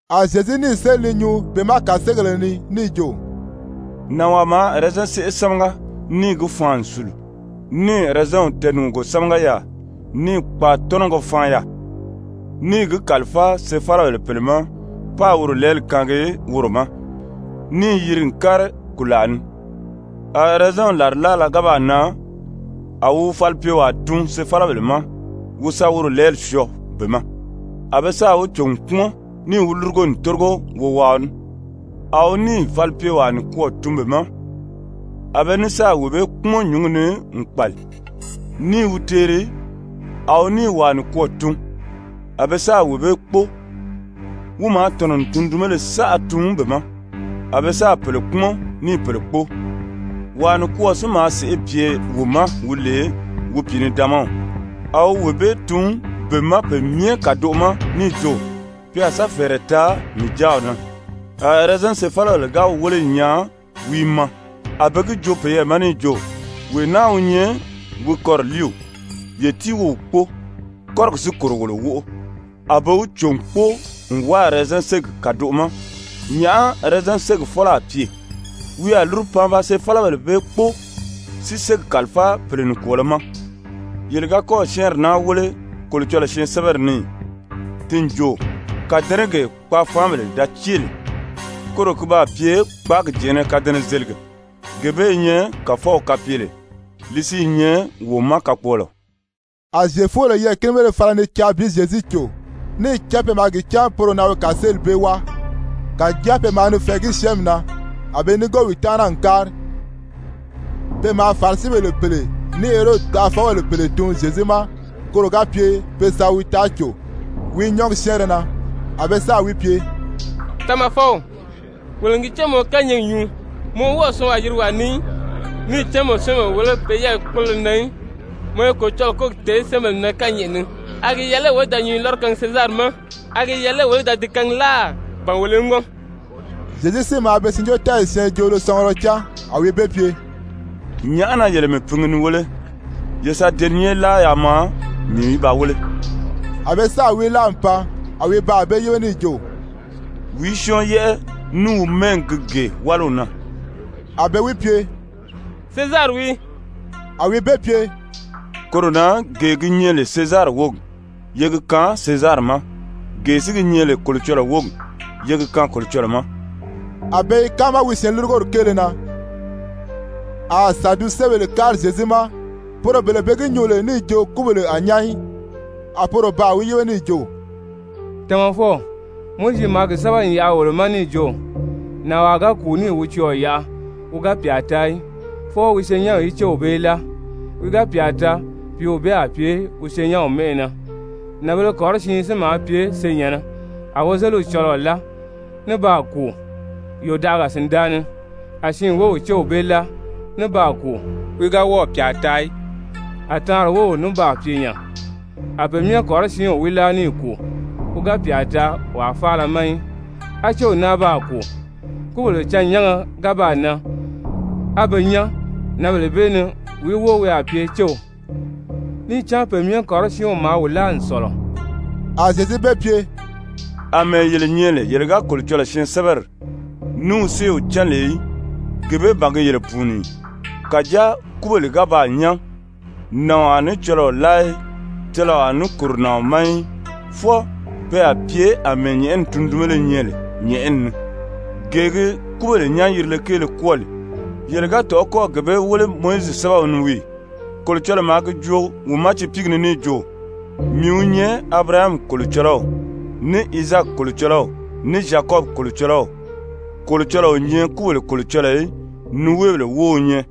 A Zyezu níì séli ni nyuu be ma kàseegéle ni níì jo: «Nànwaa maa ɛrɛzɛn séʔe sámaga níì gi faan n sùlu, níì ɛrɛzɛnw tɛɛnùgugo sámaga yaà, níì kpaatɔnɔgɔ faan yaà, níì gi kàlifáa sefalabèle pèle ma páā woro lɛɛli kaangi woro ma, níì yiri n kári kùlaa ni. A ɛrɛzɛnw làrilaala ga baa nan a wi wi falipyewaa tun sefalabèle ma wi sa woro lɛɛli syɔɔ be ma. A be sáà wi cò n kpúmɔn níì wi lúrugo n tórigo wowaaɔ ní. A wi níì falipyewaa nikwɔɔ tun be ma, a be ní sáà wee bee kpúmɔn nyǔngi ni n kpàli, ní i wi teeri. A wi níì wàa nikwɔɔ tun, a be sáà wee bee kpóo. Wi maa tɔ̀nɔ n tundunbéle saʔa tun be ma, a be sáà pèle kpúmɔn, níì pèle kpóo. Wàa nikwɔɔ si maa sèʔê pye wi ma wi lè wi pìinidaanmaw, a wi wee bee tun be ma pe myɛ kàdoʔo ma níì jo: ‹Pe a sa fɛ̀ɛrɛ taa mii jáaw na.› A ɛrɛzɛn sefalabèle ga wi wéle n nyaa wi i maa, a be gi joo peyɛɛ ma níì jo: ‹Wee naa wi nyɛ wi kɔriliiw, ye tíi wo wi kpóo, kɔ́rigi si kòro wolo wóʔo.› A be wi cò n kpóo n wáa ɛrɛzɛn ségi kàdoʔo ma. Nyàʔá ɛrɛzɛn ségi fɔ́lɔ a pye? Wi a lúru pan ba sefalabèle bee kpóo, si ségi kàlifáa pèle nikwɔɔlɔ ma. Yele ga kɔ́ɔ̀ syɛ́ɛnri naa wéle Kolocɔlɔɔ syɛɛnsɛbɛri ni ì? Ti n jo: ‹Kàdɛnɛgee kpaafaanbèle da cée lè, koro ki baa pye kpáagi jɛ̀ɛ́nnɛ kadɛnɛzelige. Gee bee i nyɛ Kàfɔw kapyele, li si i nyɛ wo ma kakpɔɔlɔ.›» A Zyefubèle yɛɛ̀kinibéle fala ni caa bi Zyezu cò, níì cán pe maa gi cán poro na wi kàseeli bee wáa, kàjáa pe maa ni fɛ̀ɛgí syɛ́ɛnmi na. A be núngo wi taana n kári. Pe maa Farisibèle pèle ní Herodi taʔafɔbèle pèle tun Zyezu ma koro ga pye pe sa wi taa cò wi nyɔ́ɔgi syɛ́ɛnrɛ na. A be sáà wi pye: «Tamafɔw, wolo n gi cán mɔ i kányɛɛgi nyuu, mɔ wɔ́ɔ o syɔɔnwaa yirigi wàa ni í. Níì cán mɔ o syɛ́ɛnbèle wéle pe yɛ́ɛyi kpólolo na í, mɔ i Kolocɔlɔɔ kólogi tèé syɛ́ɛnbèle na kányɛʔɛ ni. A gi yɛlɛ lé wolo í da nyǔnyi lɔ́rɔ kaangi Sezari ma? A gi yɛlɛ lé wolo í da di kaangi láà, ba wolo í ŋɔ́n?» Zyezu si maa be syɛɛnjóotɛɛyi siin joolo sɔngurɔ cán, a wi be pye: «Nyàʔá na yele mii pingi ni wéle? Ye sa deniye láa yaa maa mii í ba wéle.» A be sáà wi láa n pan. A wi baa be yíbe níì jo: «Wìí syɔ́ɔn yɛ́ʔɛ ní wi mɛ́ɛgi gi gee wáliw na?» A be wi pye: «Sezari wii.» A wi be pye: «Koro na gee gi nyɛ lè Sezari wógi, ye gi kaan Sezari ma. Gee si gi nyɛ lè Kolocɔlɔɔ wógi, ye gi kaan Kolocɔlɔɔ ma.» A be i káama wi syɛɛnlurugori kéele na. A Sadusebèle kári Zyezu ma, poro bele be gi nyuu lè níì jo kúbèle a nyán í, a poro baa wi yíbe níì jo: «Tamafɔw, Mowizi maa gi sɛ́bɛ n yaʔa wolo ma níì jo: Nànwaa ga kùu níì wi cɔɔ̀ yaʔa wi ga pyà taa í, fwɔɔ wi senyɛnw í céw bee láa, wi ga pyà taa, pìíw bee a pye wi senyɛnw mɛ́ʔɛ na. Nànbēle kɔrɔsiin si maa pye senyɛ̀nnɛ. A wozeliw cɔlɔɔ láa ní baa kùu, yòdaʔaga sìndaa ni. A siin wów céw bee láa ní baa kùu, wi ga wɔ́ɔ̀ pyà taa í. A taanri wów ní baa pye nya, a pe myɛ kɔrɔsiinw wi láa níì kùu, wi ga pyà taa wàa faala ma í. A céw náa baa kùu. Kúbèle cân-nyánga ga baa nan, á be nyán, nǎnbèle bee ni wìí wóo wi a pye céw? Níì cán pe myɛ kɔrɔsiinw maa wi láa n sɔ̀lɔ.» A Zyezu be pye: «Amɛɛ yele nyɛ lè yele ga Kolocɔlɔɔ syɛɛnsɛbɛri ní wi séew cán lè í, gee bee ban gi yele pùuni ì? Kàjáa kúbèle ga baa nyán, nàɔn a ní cɔlɔɔ láa í, cɔlɔɔ a ní kòro nàɔn ma í, fwɔɔ pe a pye àmɛɛ nyɛ̀ʔɛni tundunbéle nyɛ lè nyɛ̀ʔɛni ni. Gee gi kúbèle nyán-yirile kéele kwɔ́ɔ lè, yele ga tɔ̀ʔɔ́ kɔ́ɔ̀ gee bee wéle Mowizi sɛ́bɛw ni wii ì? Kolocɔlɔɔ maa gi joo wi ma tiipiigi ni níì jo: ‹Mii wi nyɛ Abirahami Kolocɔlɔw, ní Izaaki Kolocɔlɔw, ní Zyakɔbi Kolocɔlɔw.› Kolocɔlɔɔ o nyɛ kúbèle Kolocɔlɔɔ í, niweebèle wóo wi nyɛ.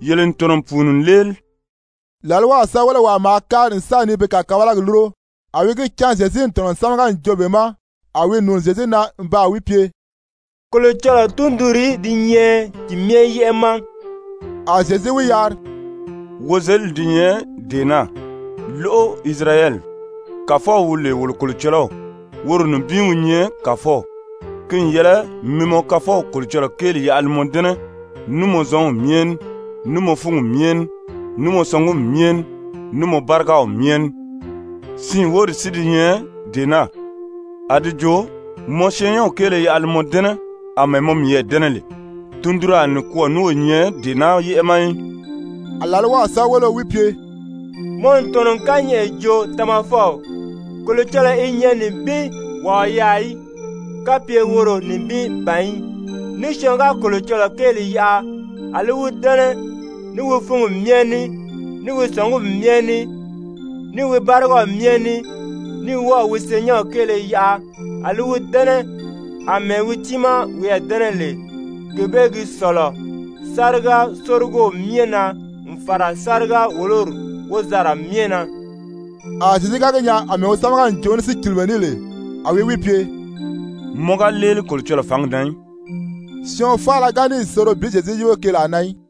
Yele n tɔ̀nɔ n pùuni n léeli.» Làlwaw sɛ́bɛwelewaa maa kári n sa ni be kàkabalagi lúro, a wi gi cán Zyezu n tɔ̀nɔ n sámaga n joo be ma, a wi nùuni Zyezu na n baa wi pye: «Kolocɔlɔɔ tundunrìí di nyɛ ti myɛ yɛ́ʔɛ ma?» A Zyezu wi yari: «Wozelidi di nyɛ dee naa: ‹Lóʔo Isirayɛli! Kàfɔw wi lè wolo Kolocɔlɔw, woro nibin wi nyɛ Kàfɔw. Ki n yɛlɛ mi mɔ Kafɔw Kolocɔlɔɔ kéeli yaʔa li mɔ dɛ́nɛ ní mɔ zɔnw myɛ ní, ní mɔ fúngi myɛ ní, ní mɔ sɔngumi myɛ ní, ní mɔ bárigaw myɛ ní.› Siin wóri si di nyɛ dee naa, a di jo: ‹Mɔ syɛɛnnyɛnw kéele yaʔa li mɔ dɛ́nɛ àmɛɛ mɔ miyɛɛ dɛ́nɛ lè.› Tundunraa nikwɔɔ ní o nyɛ dee naa yɛ́ʔɛ ma í.» A làlwaw sɛ́bɛweleo wi pye: «Mɔ n tɔ̀nɔ n kányɛʔɛ joo Tamafɔw. Kolocɔlɔɔ i nyɛ nibin, wàa o yaà í, kapye woro nibin ban í. Ní syɔɔn ga Kolocɔlɔɔ kéeli yaʔa a li wi dɛ́nɛ ní wi fúngi myɛ ní, ní wi sɔ̀ngumi myɛ ní, ní wi bárigaw myɛ ní, ní wɔ́ɔ̀ wi syɛɛnnyɛnw kéele yaʔa a li wi dɛ́nɛ àmɛɛ wi tiimaa wiyɛɛ dɛ́nɛ lè, gee bee gi sɔ̀lɔ sáriga-sórigow myɛ na n fàra sáriga-wòlori wozanra myɛ na.» A Zyezu ga gi nyaa àmɛɛ wi sámaga n joo ní sícilimɛ ní lè, a wi wi pye: «Mɔ ga léeli Kolocɔlɔɔ fǎngi na í.» Syɔɔn faala ga níì soro bi Zyezu yíbe keelaa na í.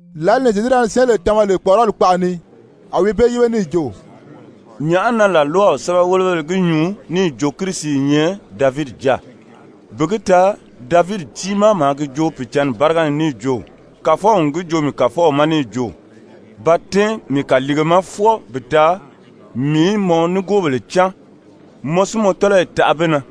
Lǎli ni Zyezu da ni syɛ́ɛnbèle tama lè kpɔ̀ʔɔrɔli kpaʔa ni, a wi be yíbe níì jo: «Nyàʔá na làlwaw sɛ́bɛwelebéle gi nyuu níì jo Kirisi i nyɛ Davidi jáa? Bi gi taa Davidi tiimaa maa gi joo Pìicǎnni báriga ni níì jo: Kàfɔw n gi joo mii Kàfɔw ma níì jo: Ba tɛ́ɛn mii kàliige ma fwɔɔ bi taa mii í mɔ nigoobèle cáan, mɔ si mɔ tɔ́lɔyi taʔa be na.›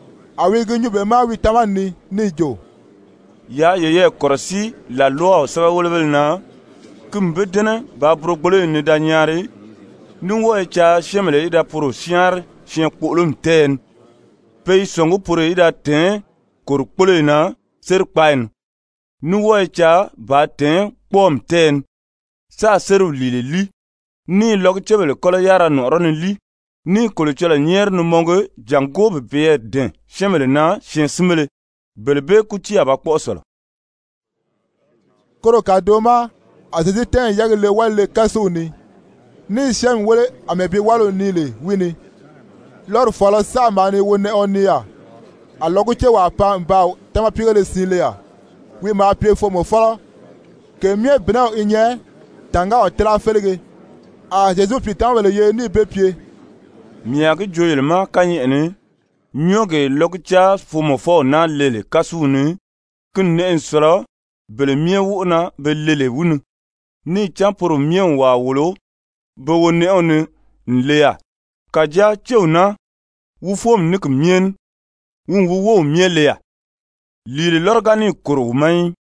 A wi i gi nyuu be ma wi tamani ni níì jo: «Yaa yeyɛɛ kɔ̀rɔsíi làlwaw sɛ́bɛwelebéle na, ki n be dɛ́nɛ bàā burogboloyi nii da nyaari, ní wɔ́ɔ i caa syɛ́ɛnbèle í da poro syáanri syɛɛnkpoʔolomi tɛ́ɛyɛ ni. Pe i sɔ̀ngí poro í da tɛ̀ɛ́n kòrikpoloyi na sérikpaayi ni, ní wɔ́ɔ i caa bàā tɛ̀ɛ́n kpɔ́ɔmi tɛ́ɛyɛ ni sáā sériw lìile líi, ní i lɔgucebèle kɔ́lɔ yárira nɔ̀ʔɔrɔ́ ni líi, ní i Kolocɔlɔɔ nyɛ́ɛri ni mɔngi jàngó bi peyɛɛ dɛ̀ɛn syɛ́ɛnbèle na syɛɛnsinbéle. Bele bee kútii a ba kpɔ́ʔɔ sɔ̀lɔ.» Koro kàdoʔo ma a Zyezu tɛ́ɛn n yɛ́ɛgi le wálile-kásuw ni, ní i syɛ́ɛnmi wéle àmɛɛ bi wáliw nii lè wi ni. Lɔ́ri fɔ̀ɔlɔ saʔa maa ni wálinɛʔɛɔ nii yaà. A lɔgucewaa pan n baa támapiigéle siin le yaà. Wi maa pye foomɔfɔlɔ. Ke myɛ bìnɛw i nyɛ tàngáaw tíla félege. A Zyezu wi pìitamabèle yeri níì be pye: «Mii a gi joo yele ma kányɛʔɛ ni, nyɔ́ɔgee lɔguca-foomɔfɔw naa le lè kásuw ni, ki n nɛʔɛ n sɔ̀lɔ bele myɛ wóʔo na be le lè wi ni. Níì cán poro myɛ n wàa wòlo be wonɛʔɛw ni n le yaà, kàjáa céw naa, wi fóomi ní ki myɛ ní, wi n wi wów myɛ le yaà, lìile lɔ́rɔ ga níì kòro wi ma í.»